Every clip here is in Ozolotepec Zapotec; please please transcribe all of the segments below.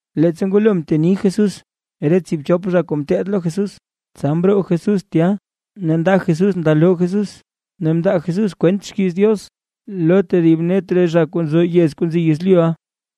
Leettsa ngwalo mteni Jesús re tsiibchop zha kuu ngeteed lo Jesús, tsa mroo Jesús tya ne nda Jesús nda loo Jesús ne mndaa Jesús kwent xkiiz Diox lo tedib net re zha kuu nzo re yez kuu nzi yezlyuʼa.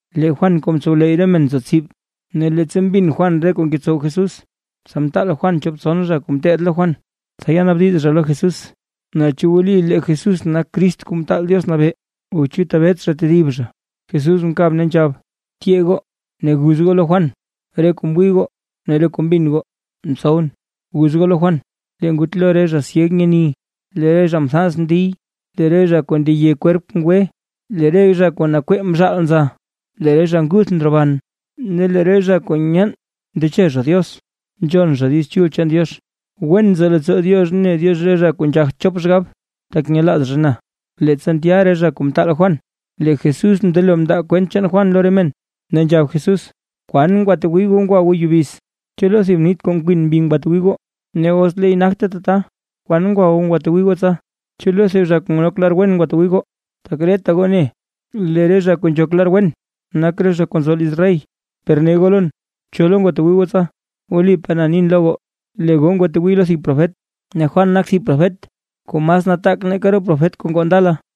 Ne lee Juan kuu mtsowleyy re men nzo tsib, ne leettsa mbin Juan re kuu ngetsow Jesús, tsa mtaal Juan chop tson zha kuu ngeteed lo Juan, tsa yanaabdiz zha lo Jesús, naa chu wli lee Jesús nak Crist Kuu Mtaal Diox Nabee o chu tebet zha tedib zha. Jesús mkab ne nzhab: ―Tyee goo, ne guz goo lo Juan re kuu mwii goo ne re kuu mbin goo ntsowʼn. Guz goo lo Juan: “Lee ngutlo re zha syeg nyeni, lee re zha mthans ndiy, lee re zha kuu ndeye kwerp ngwe, lee re zha kuu nakwee mzhaal nza; lee re zha nguth ndroban; ne lee re zha kuu nyeen ndeche zha Diox nzhon zha Diiz Chul chaan Diox. ¡Wen nzo leettsoo Diox ne Diox re zha kuu nzhagt chop xgab, tak nyelaaz zha na!” Leettsa ndya re zha kuu mtaal Juan, lee Jesús mndelo mndaa kwent chaan Juan lo re men, ne nzhab Jesús: ―¿Kwan ngwatwii goo ngwa goo yubiz? ¿Chu lo thib nith kuu nkwin mbi ngwatwii goo? Ne os leey nagte tata, ¿kwan ngwa goo ngwatwii goo tsa? ¿Chu lo thib zha kuu nok lar wen ngwa goo ngwatwii goo? Tak reta goo ne lee re zha kuu nzhok lar wen, nak re zha kuu nzo liz rey. Per ne goo lon: ¿Cho lo ngwatwii goo tsa? Wlipaa na nin lo goo, lee goo ngwatwii lo thib profet. Ne Juan nak thib profet kuu mas nataak nake re profet kuu ngoo ndala.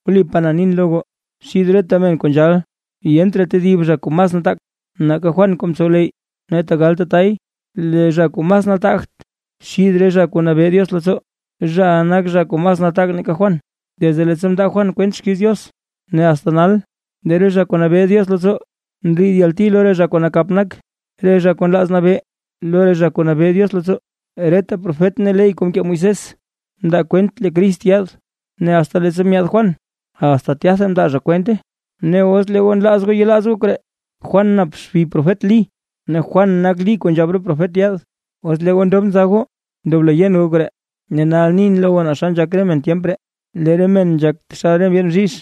Wlipaa na nin lo goo, xid reta men kuu nzhal yent raa tedib zha kuu mas nataak nake Juan kuu mtsowleyy. Ne tegal tatay, lee zha kuu mas nataagt xith re zha kuu nabee Diox leettsoo, zhaʼa nak zha kuu mas nataak nake Juan. ’Desde leettsa mndaa Juan kwent xkiiz Diox ne asta nal, lee re zha kuu nabee Diox leettsoo ndriid yalti lo re zha kuu nakap nak, re zha kuu nlaaz nabee lo re zha kuu nabee Diox leettsoo. Reta profet ne ley kuu mkee Moisés mndaa kwent lee Crist yaad, ne asta leettsa myaad Juan, asta tyatha mndaa zha kwente. Ne os lee goo nlaaz goo yelaaz goo koree, Juan nap xbi profet Lí, ne Juan nak Lí kuu nzhab re profet yaad. ¡Os lee goo ndob nza goo ndoblo yen goo koree! ’Ne nal nin lo goo naa xa nzhak re men tyemp ree. Lee re men nzhak taxal re ndyeen bzhizh,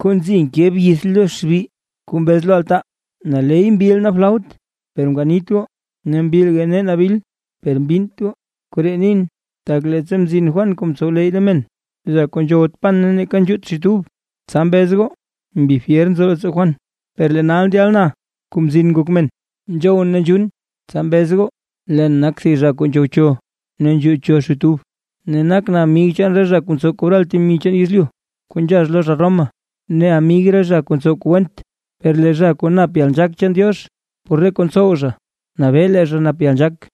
kuu nzi nke byith lo xbi, kuu mbez lo altaa: “Naley mbil nee flaut per mkanit goo ne mbilga nee nabil per mbinnt goo”. Koree nin, tak leettsa mzin Juan kuu mtsowleyy re men, zha kuu nzhowt pan neeka nzhuut xit ub, tsa mbez goo mbi fyer nzo leettsoo Juan. Per lee nal ndyal na, Kuu Mzin Ngok Men, nzhowʼn ne nzhuun, tsa mbez goo leen nak thib zha kuu nzhowcho ne nzhuucho xit ub, ne nakʼn amig re zha kuu ntsow kobral temi chaan yezlyu kuu nzhax lo zha Roma, ne amig re zha kuu ntsow re kuu went. “Per lee zha kuu nap yalnzhaak chaan Diox, por re kuu ntsow zha nabee lee zha nap yalnzhaak”.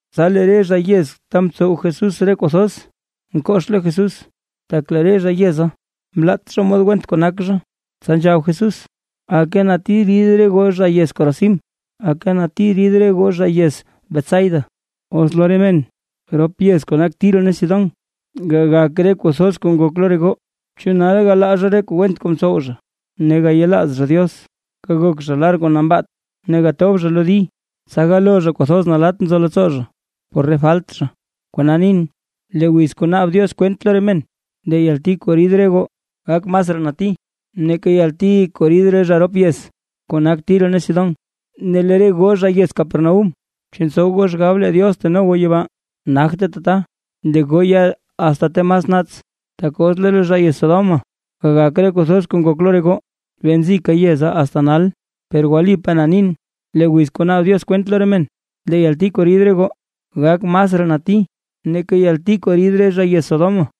Tsa lee re zha yez ta mtsow Jesús re kuu thoz mkox lo Jesús, tak lee re zha re yeza, mlaat zha mod went kuu nak zha, tsa nzhab Jesús: ―¡Aka nati rid re goo zha yez Corazín! ¡Aka nati rid re goo zha yez Betsaida! Os lo re men rop yez kuu nak Tiro ne Sidón gagak re kuu thoz kuu ngok lo re goo, chu nal galaa zha re kuu went kuu mtsow zha ne gayelaaz zha Diox, gagok zha lar kuu nambaat ne gatob zha lo di, tsa galoo zha kwathoz nalatt nzo leettsoo zha por re falt zha. Kona nin, lee wiz kuu naab Diox kwent lo re men, lee yalti kuu rid re goo gak masraa nati nake yalti kuu rid re zha rop yez kuu nak Tiro ne Sidón. Ne lee re goo zha yez Capernaúm, ¿chu ntsow goo xgab lee Diox teno goo yibaa? Nagte tata, lee goo ya asta ta mas naats. Tak os lo re zha yez Sodoma gagak re kuu thoz kuu ngok lo re goo, bee nzika yeza asta nal. Per wlipaa na nin, lee wiz kuu naab Diox kwent lo re men, lee yalti kuu rid goo gak masraa nati nake yalti kuu rid re zha yez Sodoma.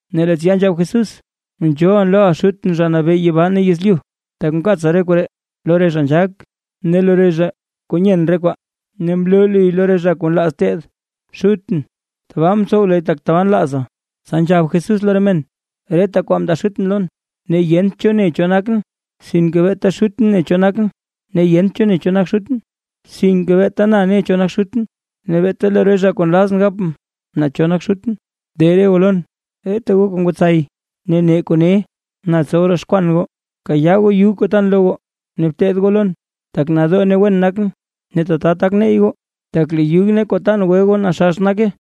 Ne lee tsya nzhab Jesús: ―Nzhoolʼn loʼa Xutʼn, Zha Nabee yibaa ne yezlyu, tak mkaatsa re koree lo re zha nzhaak ne lo re zha kuu nyen re kwaa, ne mloo luy lo re zha kuu nlaaz teed. Xutʼn, tabaa mtsow luy tak tabaa nlaaza. Tsa nzhab Jesús lo re men: ―Reta kwaa mndaa Xutʼn lon. Ne yent cho ne cho nakʼn, sinke beeta Xutʼn ne cho nakʼn. Ne yent cho ne cho nak Xutʼn, sinke beeta na ne cho nak Xutʼn, ne beeta lo re zha kuu nlazʼn gapʼn naa cho nak Xutʼn. De re goo lon, reta goo kuu ngwatsay ne nee kuu ne, na tsow roxkwan goo. Bkayaa goo yug kuu tan lo goo, ne bteed goo lon, tak nadoo ne wen nakʼn. Ne tata tak neyy goo. Tak lee yug ne kuu tan gwe goo naxax nake.